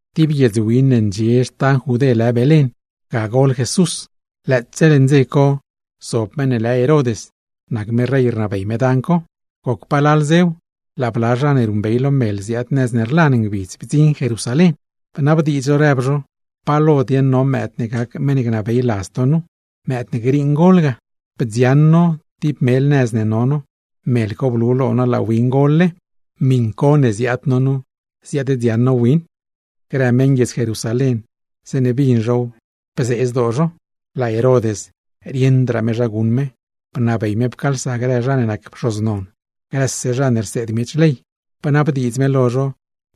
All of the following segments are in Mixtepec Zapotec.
Tib guiedz win ne ndxie xtan Judé lë Belén, ga gol Jesús. Lëëtse leṉ dze co zob meṉ ne lë Herod nac me rey ne rnabey dan co. Goc palal dzew, laa bla zha ne ruṉbey lo mel ziaad nëz ne rlan ngbidz bdziṉ Jerusalén, bnabdiidz zho rëb zho: ―¿Pa lo dieṉ no mëëd ne gac meṉ ne gnabey ladz to nu, mëëd ne griiṉ gol ga? Bdzioṉ no tib mel nëz ne no no, mel co blu lo no laa win gol-le, miṉ co ne ziaad no nu ziaaddziaṉ no win. Grë meṉguiedz Jerusalén, zeeṉe bin zhow bzee zdoo zho. Laa Herod, rieṉdraa me zha guṉ me, bnabey me pcaalsa grë zha ne nac pxoz non, grë zha ne rseed miech ley, bnabdiidz me lo zho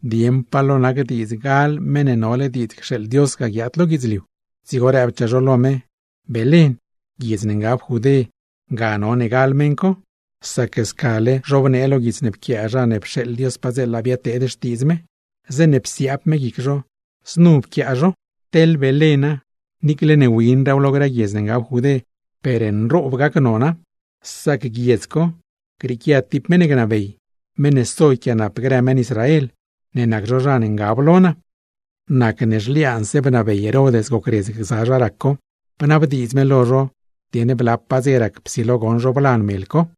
dieṉ pa lo nac diidz gal Meṉ ne nole diidz cxeeḻ Dios guiaad lo guidzliu ga. Dzigo rëbchaa zho lo me: ―Belén, guiedz ne ngab Judé ga none gal meṉ co, sac scale zhobnee lo guits ne pquiaa zha ne pxeeḻ Dios padzeela biadteed xtiidz me, zeeṉe psiaab me guic zho znu bnee zho: Teḻ Belén, niicle ne winraaw lo grë guiedz ne ngab Judé, per nroob nona; sac goṉ ga grieequia tib meṉ ne gnabey, meṉ ne so yquiaanap grë meṉ Israel, ne nac zho zha ne ngab lo naa. Nacne zhliaanse bnabey Herod gocredz gza zha rac co, bnabdiidz me lo zho dieṉ blapaa dze rac psilo goṉ zho blan mel co.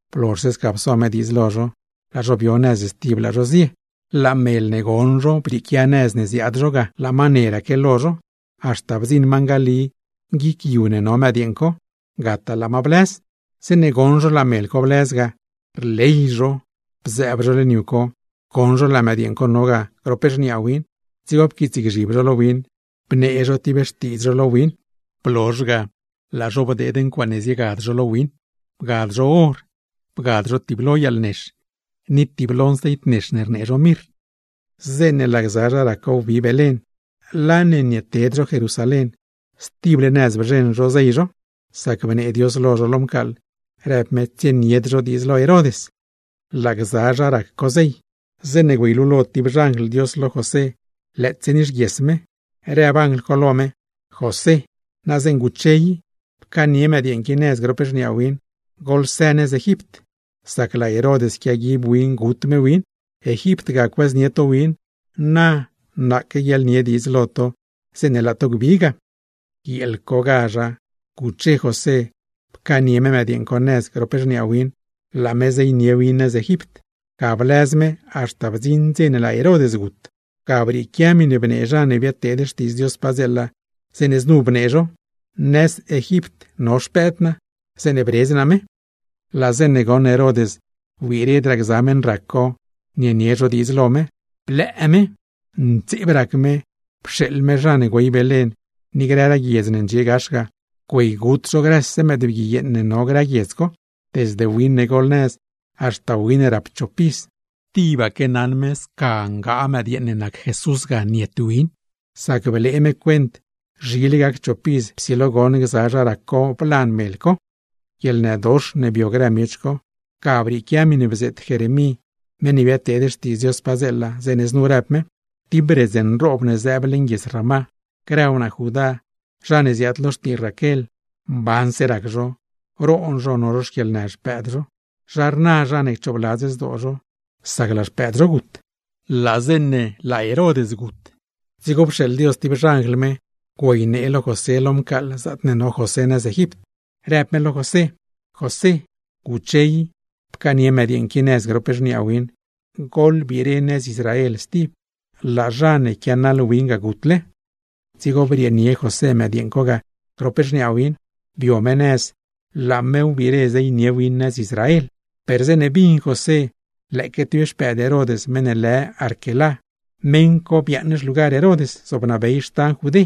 Blozhse sca pso me diidz lo zho, laa zho bio nëz stib laa zho zie. Laa mel ne goṉ zho brieequia nëz ne ziaad zho ga, laa ma neraque lo zho; haxta bdziṉ ma ngali guic yu ne no mëdyeeṉ co, gataa laa ma blëz. Zeeṉe goṉ zho laa mel co blëz ga, per nli rley zho. Bzëëb zho leṉ yu co, goṉ zho laa mëdyeeṉ co no ga grop xniaa win, dzigo pquiitsgzhib zho lo win, bnee zho tib xtiidz zho lo win. Blozh ga blee zho ncuaaṉe zienie zho lo win, blee zho or, blee zho tiblo yaalnex, ni tiblo nceit nex rnee zho mirr, bgad zho lo win. Zeeṉe laa gza zha rac co wbi Belén, laa ne nieted zho Jerusalén, stible nëz bzheṉ zho zey zho; sac bnee Dios lo zho lo mcaaḻ, rëb me tsienied zho diidz lo Herod. Laa gza zha rac co zey, zeeṉe güeylulo tib xanjl Dios lo José lëëtse nixguies me, rëb anjl co lo me: ―José, na zeeṉa guche i pcaanie mëdyeeṉ qui nëz grop xniaa win, goḻsë nëz Egipt, sac laa Herod yquiaguib win gut me win. Egipt, ga cuëznie to win, na naaque guiaḻnie diidz lo to zeeṉe laa to gbi ga. Guieel cogazh guche José, pcaanie me mëdyeeṉ co nëz grop xniaa win, laa zho ziese nëz Egipt; ga blëz me haxta bdziṉ dze ne laa Herod gut. Ga brieequia miṉe bnee zha ne biadteed xtiidz Dios padzeela, zeeṉe znu bnee zho: “Nëz Egipt no xpëëd naa, zeeṉe bredz naa me.” Laa zeeṉe goṉ Herod wbiredraa gza meṉ rac co nienie zho diidz lo me, per nli blëë me. Ntseeb rac me, pxeeḻ me zha ne güey Belén ni grëraa guiedz ne ndxie gax ga, güeygut zho grëse mëëdbgui yeeṉ ne no grë guiedz co, desde win ne golnëz, haxta win ne rap chop iz. Tibaque naṉ me sca ngaa mëdyeeṉ ne nac Jesús ga niet win, sac blee me cuent zhile gac chop iz psilo goṉ gza zha rac co blan mel co. Guieḻnëdox ne bio grë miech co, ga brieequia miṉe bzeet Jeremí meṉ ne biadteed xtiidz Dios padzeela, zeeṉe znu rëb me: Tib redz nroob ne zëëb leṉ guiedz Ramá. Grë wnaa Judá, zha ne ziaad lo xtii Raquel, mbanse rac zho, roon zho no zho xquieḻnë xpëëd zho; zha rna zha ne cchoobladz zdoo zho, sac laa xpëëd zho gut. Goc palal dzew laa Herod gut, dzigo pxeeḻ Dios tib xanjl me güeynee lo José lo mcaaḻ zaatne no José nëz Egipt, rëb me lo José: ―José, guche i, pcaanie mëdyeeṉ qui nëz grop xniaa win, goḻbire nëz Israel stib; laa zha ne quianaḻ win ga gutle. Dzigo brieenie José mëdyeeṉ co ga grop xniaa win, bio me nëz laa me wbire zeynie win nëz Israel. Per zeeṉe bin José lëëque tib xpëëd Herod meṉ ne lë Arquelá, meṉ co biaaṉ xlugar Herod zobnabey xtan Judé,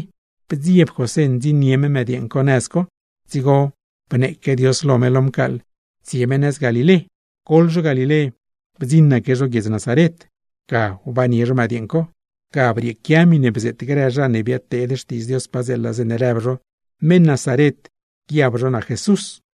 bdzieb José ndziṉnie me mëdyeeṉ co nëz co. Dzigo bneeque Dios lo me lo mcaaḻ tsie me nëz Galilé. Goḻ zho Galilé, bdziṉaque zho guiedz Nazaret, ga wbannie zho mëdyeeṉ co. Ga brieequia miṉe bzeet grë zha ne biadteed xtiidz Dios padzeela, zeeṉe rëb zho: meṉ Nazaret guiab miech nac Jesús.